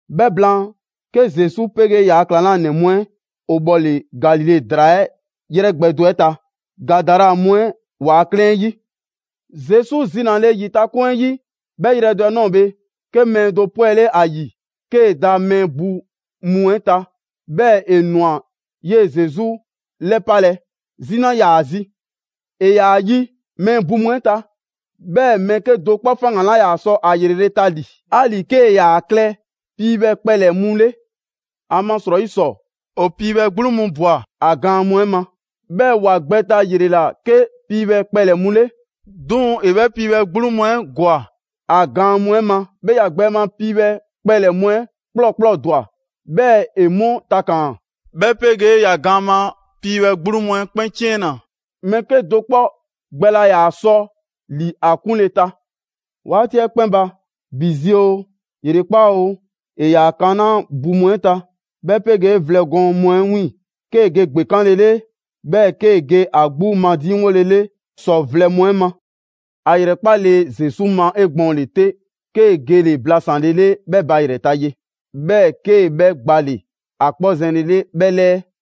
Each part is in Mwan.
'Bhɛ blaan, 'ke Zesu 'pegee ‑yaa' ‑klaŋlanɛ mu 'ɛ ‑o 'bhɔle‑ Galile ‑draa 'ɛ 'yrɛ gbɛ do 'ɛ ta, Gadara mu 'ɛ ‑waa' 'klɛɛn 'ɛ 'yi. Zesu zinale ‑yitakoŋ 'ɛ 'yi, 'bhɛ yrɛ do 'ɛ ꞊nɔɔ bhe, 'ke mɛɛ do 'pwɛle ‑a ‑yi 'kee‑ da mɛɛ bu mu 'ɛ ta, 'bhɛɛ‑ ‑e ꞊nwa 'yee‑ Zesu ‑lɛpalɛ. Zina 'yaa‑ ‑a zi. ‑E ‑yaa yi mɛɛ bu mu 'ɛ ta, 'bhɛɛ‑ mɛɛ 'kedo‑ 'kpɔ faŋgan‑ 'laa ‑yaa sɔ 'a ‑yrele' ta ‑li, 'ali‑ 'kee‑ ‑yaa klɛ piibhɛ kpɛlɛ‑ mu 'le. ‑Amasrɔyi ‑sɔ, ‑o piibhɛ 'gbluŋ mu ꞊bwa a gaan mu 'ɛ ma, 'bhɛɛ‑ ‑wa gbɛ ta ‑yrela' 'ke piibhɛ kpɛlɛ‑ mu 'le. 'Duŋ‑ ‑e 'bhɛ piibhɛ 'gbluŋ mu 'ɛ ‑gwa ‑a gaan mu 'ɛ ma, 'bhɛɛ‑ ‑ya gbɛ ma piibhɛ kpɛlɛ‑ mu 'ɛ ‑kplɔɔkplɔɔdwa, 'bhɛɛ‑ ‑e 'mu takaan‑; 'bhɛ 'pegee ‑ya gaan ma piibhɛ 'gbluŋ mu 'ɛ 'kpɛn 'ciɛnna‑. Mɛɛ 'kedo‑ 'kpɔ gbɛ laa ‑yaa sɔ ‑li ‑a 'kunle‑ ta. 'Waati 'ɛ 'kpɛn ba, ‑bi zi oo, ‑yrekpaa' oo, ‑e ‑yaa kanaa' bu mu 'ɛ ta, 'bhɛ 'pegee vlɛ gɔɔn mu 'ɛ 'wiiŋ‑, 'kee‑ ge gbekanlele, 'bhɛɛ‑ 'kee‑ ge a 'gbu madiŋwole 'le ‑sɔ vlɛ mu 'ɛ ma. ‑A ‑yrɛkpale Zesu ma 'egbɔɔnle 'te, 'kee‑ gele‑ blasanlele 'bhɛ ba ‑yrɛ ta ye, 'bhɛɛ‑ 'kee‑ 'bhɛ gbale‑ ‑a 'kpɔ zɛnlele 'bhɛ 'lɛɛ.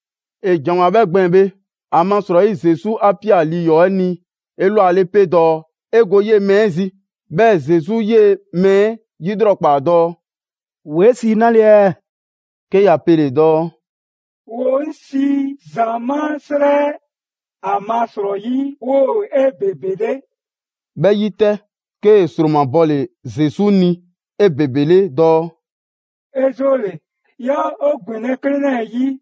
‑E ‑janwoa 'bhɛ gbɛɛn‑ bhe, ‑amasrɔyi Zesu 'a ꞊pia lii ‑yɔɔ' 'ɛ ni 'elwale 'pe dɔɔ ‑e go 'yee‑ mɛɛ 'ɛ zi. 'Bhɛɛ‑ Zesu 'yee‑ mɛɛ 'ɛ 'lrɔkpaa dɔɔ: «‑Wo 'e sii 'nale ɛɛ?» 'Ke ‑ya pele‑ dɔɔ: «‑Wo 'ŋ sii ‹‑zamaa' 'srɛ, ‑amasrɔyi 'woo‑ 'ebebele.›» 'Bhɛ 'yi 'tɛ, 'kee‑ ‑sromabɔle Zesu ni 'ebebele dɔɔ: «'E 'zoole‑, 'yaa 'o ‑gbinlɛ' 'klɛɛn 'lɛɛ‑ 'yi.»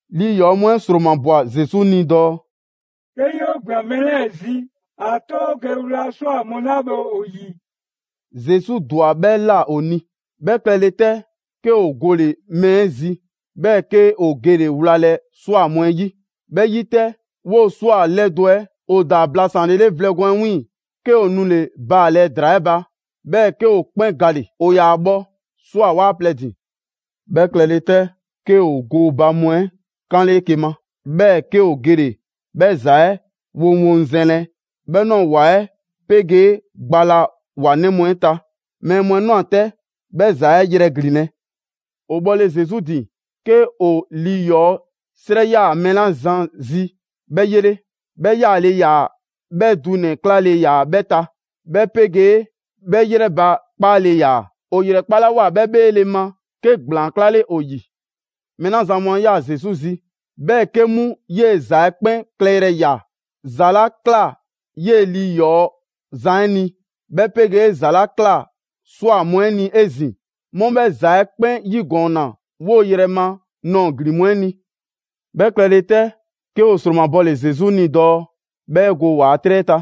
Lii ‑yɔɔ' mu 'ɛ ‑sromabwa Zesu ni dɔɔ: «'Ke 'yoo ‑gbian mɛɛ 'lɛɛ‑ zi ‑a 'to 'o ge wla ꞊swa mu 'la bhe ‑o 'yi.» Zesu ‑dwa 'bhɛ ꞊la ‑o ni. 'Bhɛ klɛle 'tɛ, 'ke ‑o gole‑ mɛɛ 'ɛ zi, 'bhɛɛ‑ 'ke ‑o gele‑ wlalɛ ꞊swa mu 'ɛ 'yi. 'Bhɛ 'yi 'tɛ, 'woo‑ ꞊swa 'lɛdo‑ 'ɛ ‑o ‑daa blasanlele vlɛ gɔɔn 'ɛ 'wiiŋ‑, 'ke ‑o nule‑ baalɛ ‑draa 'ɛ ba, 'bhɛɛ‑ 'ke ‑o 'kpɛn gale‑. ‑O ‑yaa bhɔ ꞊swa 'waa plɛ ‑din. 'Bhɛ klɛle 'tɛ, 'ke ‑o gooba mu 'ɛ 'kanle 'eke‑ ma, 'bhɛɛ‑ 'ke ‑o gele‑ 'bhɛ ‑za 'ɛ 'woŋwoŋzɛnlɛ 'bhɛ ꞊nɔɔ ‑wa 'ɛ 'pegee gba la ‑wa 'nɛ mu 'ɛ ta. Mɛɛ mu 'ɛ ꞊nwa 'tɛ 'bhɛ ‑za 'ɛ yrɛglinlɛ. ‑O bhɔle Zesu ‑din, 'ke ‑o lii ‑yɔɔ' 'srɛ 'yaa‑ mɛɛ 'la zan zi 'bhɛ 'yele. 'Bhɛ 'yaale‑ ‑yaa, 'bhɛɛ‑ dunɛ‑ 'klale‑ ‑yaa 'bhɛ ta, 'bhɛ 'pegee 'bhɛ ‑yrɛbakpaale ‑yaa. ‑O ‑yrɛkpalawoa 'bhɛ 'bheele‑ ma, 'ke ‑gblaan 'klale ‑o ‑yi. Mɛɛ 'la zan mu 'a ꞊ya Zesu zi, 'bhɛɛ‑ 'ke 'mu 'yee‑ ‑za 'ɛ 'kpɛn klɛyrɛ ꞊ya, ‑za 'la ꞊kla 'yee‑ lii ‑yɔɔ' zan 'ɛ ni, 'bhɛ 'pegee ‑za 'la ꞊kla ꞊swa mu 'ɛ ni 'ezin‑, 'mu 'bhɛ ‑za 'ɛ 'kpɛn 'yigɔɔnna 'woo‑ yrɛ ma ꞊nɔɔ ‑glin mu 'ɛ ni. 'Bhɛ klɛle 'tɛ, 'ke ‑o ‑sromabɔle Zesu ni dɔɔ 'bhɛ go ‑waa' 'trɛ 'ɛ ta.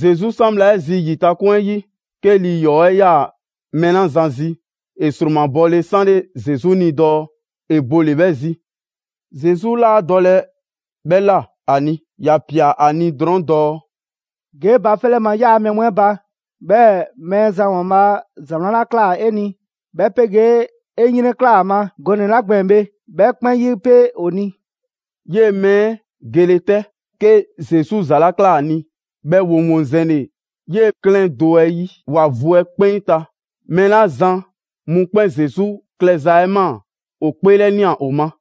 Zesu 'san bhla 'ɛ zi ‑yitakoŋ 'ɛ 'yi, 'ke lii ‑yɔɔ' 'ɛ 'yaa‑ mɛɛ 'la zan zi, ‑e ‑sromabɔle 'sanle Zesu ni dɔɔ ‑e bole‑ 'bhɛ zi. Zesu 'laa dɔle 'bhɛ ꞊la ‑a ni, ‑ya ꞊pia ‑a ni drɔɔn' dɔɔ: «Ge 'e ba 'fɛ 'lɛ ma 'yaa‑ mɛɛ mu 'ɛ ba, 'bhɛɛ‑ Mɛɛzan ‑Waanbhaa' ‑za 'wlan 'la ꞊kla 'e ni, 'bhɛ 'pegee 'e 'yrɛnklaa‑ ‑a ma gɔnɛ‑ 'la gbɛɛn‑ bhe, 'bhɛ 'kpɛn 'yipe‑ ‑o ni.» 'Yee‑ mɛɛ 'ɛ gele 'tɛ, 'kee‑ Zesu ‑za 'la ꞊kla ‑a ni 'bhɛ 'woŋwoŋzɛnle 'yee‑ 'klɛɛn do 'ɛ 'yi ‑wa vu 'ɛ 'kpɛn ta. Mɛɛ 'la zan mu 'kpɛn Zesu klɛza 'ɛ ꞊maa, ‑o 'kpeelɛnia ‑o ma.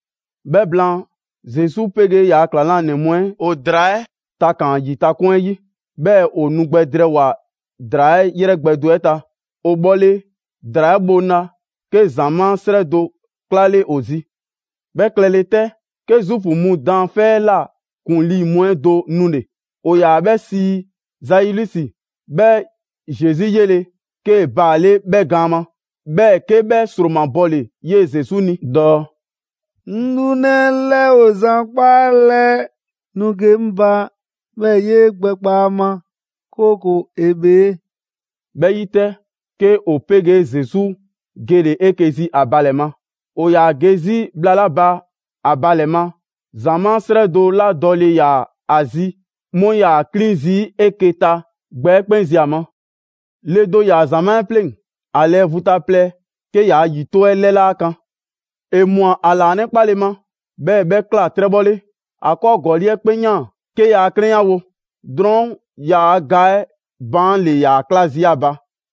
'Bhɛ ‑blaan, Zesu 'pegee ‑yaa' ‑klaŋlanɛ mu 'ɛ ‑o ‑draa 'ɛ takaan‑ ‑yitakoŋ 'ɛ 'yi, 'bhɛɛ‑ ‑o nu gbɛ drɛɛwoa‑ ‑draa 'ɛ 'yrɛ gbɛ do 'ɛ ta. ‑O bhɔle ‑draa 'ɛ bhoŋla, 'ke ‑zamaa' 'srɛ do 'klale ‑o zi. 'Bhɛ klɛle 'tɛ, 'ke Zuufu mu daanfɛ' 'ɛ ꞊la ‑kuŋlii' mu 'ɛ do nule‑, ‑o ‑yaa 'bhɛ sii Zailusi. 'Bhɛ Zesu 'yele‑, 'kee‑ baale' 'bhɛ gaan ma. 'Bhɛɛ‑ 'ke 'bhɛ ‑sromabɔle 'yee‑ Zesu ni dɔɔ: «'Ŋ 'lunɛ 'ɛ 'lɛ ‑o zan 'kpaalɛ‑, nu ge 'ŋ ba, 'bhɛɛ‑ 'yee‑ gbɛ 'kpa ‑a ma, 'kooko‑ ‑e bhee.» 'Bhɛ 'yi 'tɛ, 'ke ‑o 'pegee Zesu gele‑ 'eke‑ zi ‑a ba ‑lɛ ma. ‑O ‑yaa ge 'zi bhla 'la ba ‑a ba ‑lɛ ma, ‑zamaa' 'srɛ do 'la dɔle ‑yaa ‑a zi 'mu 'yaa‑ 'klin zii' 'eke‑ ta gbɛ 'ɛ 'kpɛn zi ‑a ma. Le do ‑yaa ‑zamaa' 'ɛ 'pleŋ‑, ‑a lɛɛ vu ta plɛ 'ke yaa ‑yito' 'ɛ 'lɛ 'laa kan. ‑E ꞊mwa ‑a ‑laanɛkpale ma, 'bhɛɛ‑ 'bhɛ ꞊kla 'trɛbhɔle. ‑A 'kɔɔ ‑gɔli' 'ɛ 'kpɛn 'yaan‑ 'ke yaa 'klɛnyawo. Drɔɔn' yaa ga 'ɛ baan' ‑le ‑yaa 'kla zii' ‑a ba.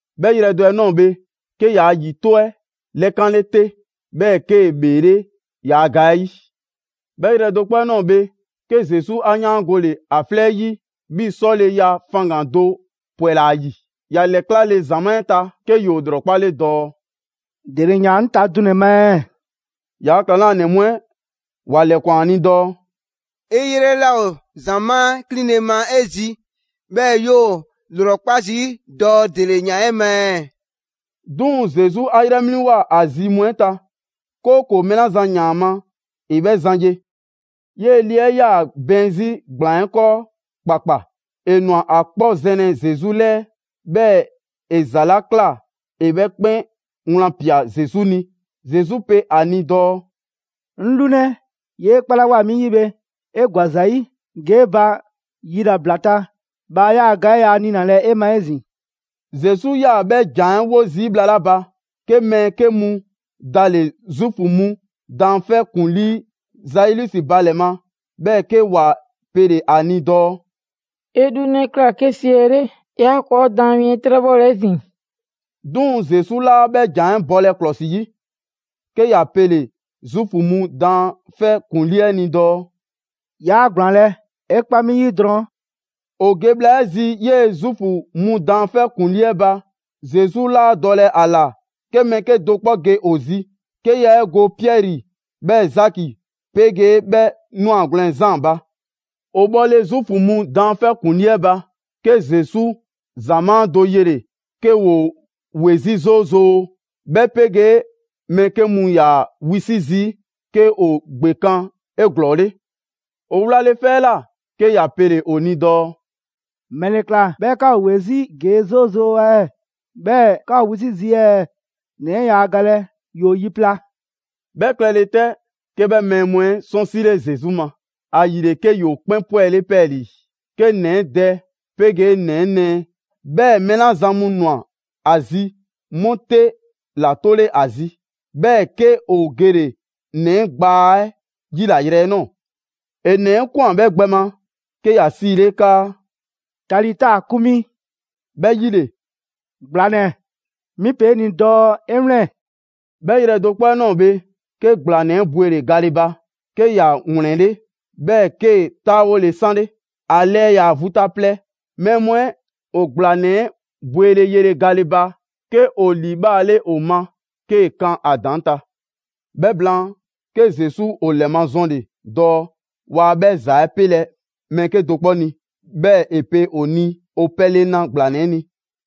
'Bhɛ yrɛ do 'ɛ ꞊nɔɔ bhe, 'ke yaa ‑yito' 'ɛ 'lɛkanle 'te; 'bhɛɛ‑ 'kee‑ ‑bheele' yaa ga 'ɛ 'yi. 'Bhɛ yrɛ do 'kpɔ 'ɛ ꞊nɔɔ bhe, 'ke Zesu 'a 'yaangole ‑a 'flɛ 'yi 'bhii‑ 'sɔleya faŋgan‑ do ‑pwɛla ‑a ‑yi. ‑Ya ‑lɛklale ‑zamaa' 'ɛ ta, 'ke ‑yoo ‑lrɔkpale dɔɔ: «‑De ‑le ‑yaan 'ŋ ta dunɛ‑ ma ɛɛ?» ‑Yaa' ‑klaŋlanɛ mu 'ɛ ‑wa ‑lɛkwan a ni dɔɔ: «'E 'yrɛ 'laa ‑o ‑zamaa' 'ɛ 'klinle‑ ma 'e zi, 'bhɛɛ‑ 'yoo 'o 'lrɔkpa zii' dɔɔ ‑dele ‑yaan 'e ma ɛɛ?» 'Duŋ‑ Zesu 'a 'yrɛ 'mliŋwoa‑ ‑a zi mu 'ɛ ta, 'kooko‑ mɛɛ 'la zan ‑yaan ‑a ma ‑e 'bhɛ zan ye. 'Yee‑ le 'ɛ 'yaa‑ bɛɛn 'zi gblaan 'ɛ 'kɔɔ ‑kpakpa. ‑E ‑nwa ‑a 'kpɔ zɛnlɛ Zesu 'lɛɛ, 'bhɛɛ‑ ‑e ‑za 'la ꞊kla ‑e 'bhɛ 'kpɛn wlan꞊pia Zesu ni. Zesu pe ‑a ni dɔɔ: «'Ŋ 'lunɛ, 'yee 'kpalawoa 'mi 'yi bhe, 'e ‑gwa ‑za 'yi, ge 'e ba yilabla ta! Bhaa 'yaa‑ ga 'ɛ yaa niinalɛ 'e ma 'ezin‑.» Zesu 'yaa‑ 'bhɛ ‑jan 'ɛ 'wo zii' bhla 'la ba, 'ke mɛɛ 'ke mu dale‑ Zuufu mu daanfɛ' 'ɛ ‑kuŋlii' Zailusi ba ‑lɛ ma, 'bhɛɛ‑ 'ke ‑wa pele‑ ‑a ni dɔɔ: «'E 'lunɛ 'ɛ ꞊kla 'ke siɛle', 'yaa ‑kɔɔ' daan mi 'ɛ 'trɛbhɔlɛ 'ezin‑.» 'Duŋ‑ Zesu 'laa 'bhɛ ‑jan 'ɛ bɔlɛ ‑klɔsi 'yi, 'ke ‑ya pele‑ Zuufu mu daanfɛ' ‑kuŋlii 'ɛ ni dɔɔ: «'Yaa ‑gblaanlɛ', 'e 'kpa 'mi 'yi drɔŋ.» ‑O ge bhla 'ɛ zi 'yee‑ Zuufu mu daanfɛ' ‑kuŋlii 'ɛ ba, Zesu 'laa dɔlɛ ‑a ‑la 'ke mɛɛ 'kedo‑ 'kpɔ ge ‑o zi, 'ke ya 'e go Piɛri, 'bhɛɛ‑ Zaki 'pegee 'bhɛ 'nwagwlɛn‑ Zaan ba. ‑O bhɔle Zuufu mu daanfɛ' ‑kuŋlii 'ɛ ba, 'ke Zesu ‑zamaa' do yele‑ 'ke ‑woo ‑we 'zi 'zoozoo‑, 'bhɛ 'pegee mɛɛ 'ke mu ‑yaa wisi' zii' 'ke ‑o ‑gbekan' 'eglɔɔle. ‑E wlale 'fɛ 'ɛ ꞊la, 'ke ‑ya pele‑ ‑o ni dɔɔ: «‑Mɛle ꞊kla 'bhɛɛ‑ 'ka ‑o ‑we 'zi ‑gee' 'zoozoo‑ ɛɛ, 'bhɛɛ‑ 'ka ‑o wisi' zii' ɛɛ? ‑Nɛ 'ɛ yaa galɛ, ‑yoo yi pla.» 'Bhɛ klɛle 'tɛ, 'ke 'bhɛ mɛɛ mu 'ɛ 'sɔnsile Zesu ma. ‑Ayile, 'ke ‑yoo 'kpɛn 'pwɛle 'pɛɛlii‑. 'Kee‑ ‑nɛ dɛ 'pegee ‑nɛ 'ɛ nɛɛ, 'bhɛɛ‑ mɛɛ 'la zan mu ꞊nwa ‑a zi 'mu 'te ‑la 'tole 'a zi. 'Bhɛɛ‑ 'ke ‑o gele‑ ‑nɛ gbaa 'ɛ 'yilayrɛ 'ɛ ꞊nɔɔ. ‑E ‑nɛ 'ɛ ꞊kwan 'bhɛ gbɛ ma 'ke ‑ya 'siile 'kaa: «Talita kumi!» 'Bhɛ 'yile‑: «‑Gblanɛ, 'mi pe 'e ni dɔɔ 'e 'wlɛn‑!» 'Bhɛ yrɛ do 'kpɔ 'ɛ ꞊nɔɔ bhe, 'ke ‑gblanɛ 'ɛ bwele‑ gale ba, 'ke ‑ya ‑wlɛnle', 'bhɛɛ‑ 'kee‑ 'taawole 'sanle. ‑A lɛɛ ‑yaa vu ta plɛ. Mɛɛ mu 'ɛ ‑o ‑gblanɛ 'ɛ bwele yele gale ba, 'ke ‑o liibhaale ‑o ma 'kee‑ kan a ‑daŋ' ta. 'Bhɛ blaan, 'ke Zesu ‑o ‑lɛmazɔnle‑ dɔɔ waa 'bhɛ ‑za 'ɛ 'pelɛ‑ mɛɛ 'kedo‑ 'kpɔ ni. 'Bhɛɛ‑ ‑e pe ‑o ni ‑o pɛle na ‑gblanɛ 'ɛ ni.